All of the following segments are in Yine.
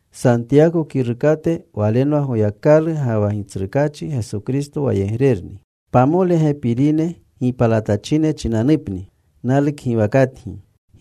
Santiyako kirukate. Walenwa Goyakalu ga wa Gitsrukaachi Geso Kristo wayegrerni. Pamole gepinerune gipalatachine chinanupni. Nalukgiwakatgi.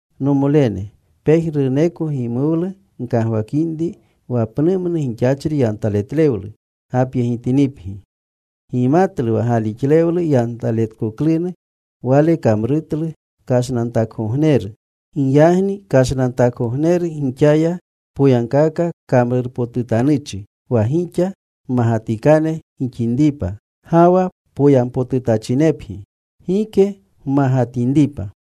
Nomolene, pejnuruko gimuwlu gkagwakinri wa pnumnu gixachri yantaletlewlu gapyegitinipgi. Gimatlu wa galixlewlu yantaletkoklunu, wale kamrutlu kashnantakgogneru. Giyagni kashnantakgogneru gixaya poyagkaka kamrurpotutanuchi, wa gixa mmagatikane gixinripa, ga wa poyampotutachinepgi. Gike gmagatinripa.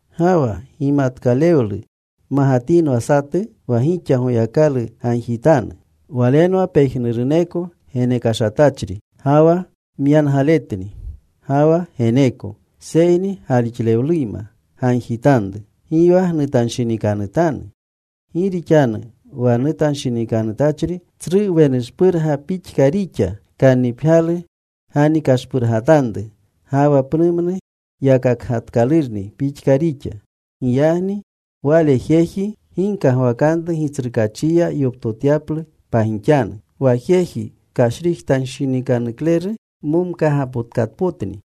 Ga wa gimatkalewlu magatinwa satu wa gixa, Goyakalu gagjitanu. Walenwa pejnuruneko genekashatachri, ga wa myangaletni. Ga wa geneeko. Seyni galixlewleyma gagjitanru. Gi wa gnutanshinikanutanu. Gi rixanu wa nutanshinikanutachri tsru wenushpurga pixka rixa, kannipgyalu ganikashpurgatanru ga wa pnumnu yakakgatkalurni pixka rixa. Giyagni wale jeji gi kagwakanru Gitsrukaachiya yoptotyaplu pagixanu. Wa jeji kashrijtanshinikanukleru momkaagapotkatpotni.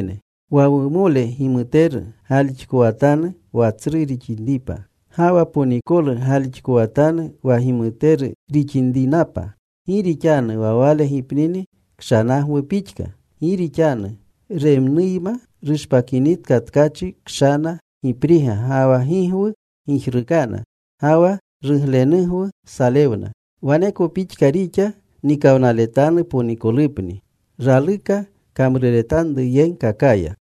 Wa wumole gimuteru galixkowatanu wa tsru rixinripa. Ga wa ponikolu galixkowatanu wa gimuteru rixinrinapa. Gi rixanu wa wale gipnini kshanagwu pixka. Gi rixanu remnuyma rushpakinitka tkachi, kshana gipriga ga wa gigwu gijrukana, ga wa ruglenugwu salewna. Waneko pixka rixa nikawnaletanu ponikolupni raluka kamruretanruyegkakaya.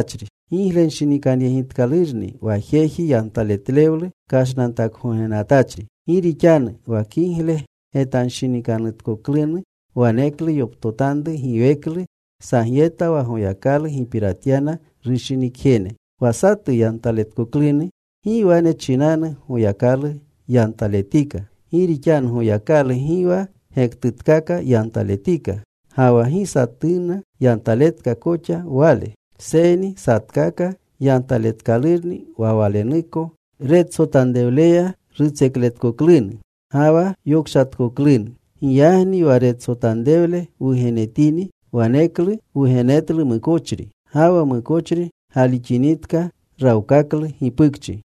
Giglenshinikanyegitkalurni wa jeji yantaletlewlu kashnantakgognenatachri. Gi rixanu wa kigle getanshinikanutkoklunu waneklu yoptotanru giweklu sagyeta, wa Goyakalu gipiratyana rushinikjene. Wa satu yantaletkoklunu, gi wane chinanu, “Goyakalu nyantaletika.” Gi rixanu Goyakalu gi wa gektutkaka yantaletika. Ga wa gi satuuna yantaleta koxa Wale. Seyni satkaka yantaletkalurni wa walenuko retsotanrewleya rutsekletkoklunu ga wa yokshatkoklunu. Giyagni wa getsotanrewlu wugenetini, waneklu wugenetlu mukochri. Ga wa mukochri galixinitka, rawkaklu gipukchi.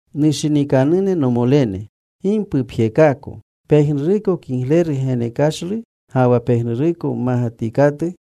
Nushinikanune nomolene, gi mpupjekaako. Pejnuruko kigleru genekashlu, ga wa pejnuruko mmagatikatu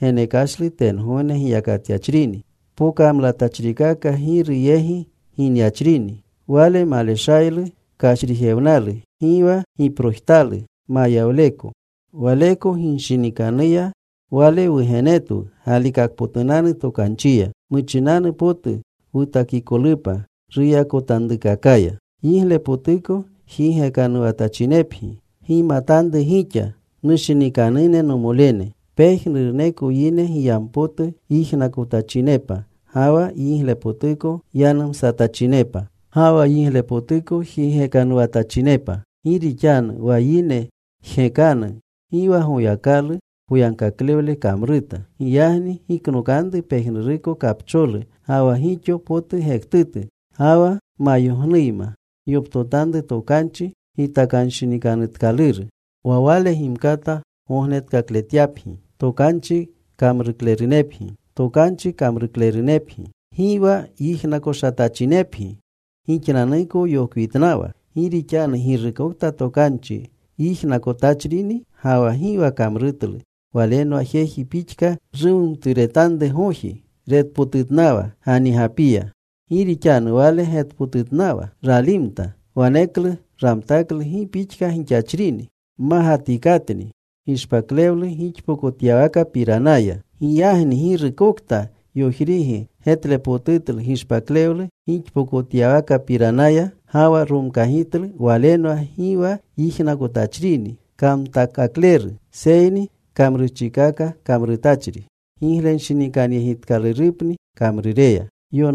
genekashlu tengogne giyakatyachrini. Pokamlatachrikaka Giru yegi ginyachrini. Wale maleshaylu kashrijewnalu, gi wa giprojtalu mayawleko. Waleko rushinikanuya Wale wugenetwu galikakpotunanu tokanchiya. Muchinanu potu wutakikolupa ruyakotanrukakaya. Yiglepotuko jigekanuwatachinepgi Gimatanru gixa, nushinikanune nomolene. Pejnuruneko yine giyampotu yijnakotachinepa, ga wa yiglepotuko yanumsatachinepa, ga wa yiglepotuko jigekanuwatachinepa. Gi rixanu wa yine jgekanu gi wa Goyakalu poyagkaklewle kamruta. Giyagni giknokanru pejnuruko kapcholu ga wa gixo potu gektutu. Ga wa gmayognuyma gyoptotanru tokanchi gitakanshinikanutkaluru. Wa wale gimkata gognetkakletyapgi. Tokanchi kamruklerunepgi. Gi wa yijnakoshatachinepgi gixnanuko yokwitnawa. Gi rixanu girukokta tokanchi yijnakotachrini, ga wa gi wa kamrutlu, walenwa jeji pixka rumumturetanrugoji retpotutnawa ganigapiya. Gi rixanu wale getpotutnawa. Ralimta. Waneklu ramtaklu gi pixka gixachrini. Mmagitikatni gishpaklewlu gixpokotyawakapiranaya. Giyagni girukokta yojrigi getlepotutlu gishpaklewlu gixpokotyawakapiranaya, ga wa romkagitlu, walenwa gi wa yijnakoshatachrini kamtakakleru, seyni kamrurchikaka kamrutachri. Giglenshinikanyegitkalurupni kamrureya.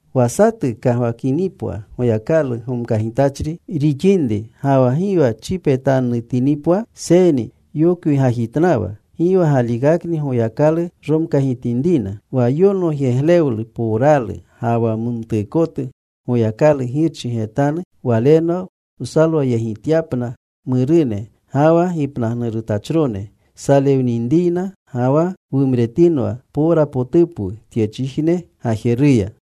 Wa satu kagwakinipwa Goyakalu gomkagitachri rixinri ga wa gi wa chipetannutinipwa seyni yokwigajitnawa, gi wa galikakni Goyakalu romkagitinrina. Wa yonogyeglewlu powralu ga wa mumtuukotu Goyakalu Girchi getanu, walenwa wsalwayegityapna murune ga wa gipnagnurutachrone salewninriyna, ga wa wumretinwa powrapotupwu tyechijne gajeruya.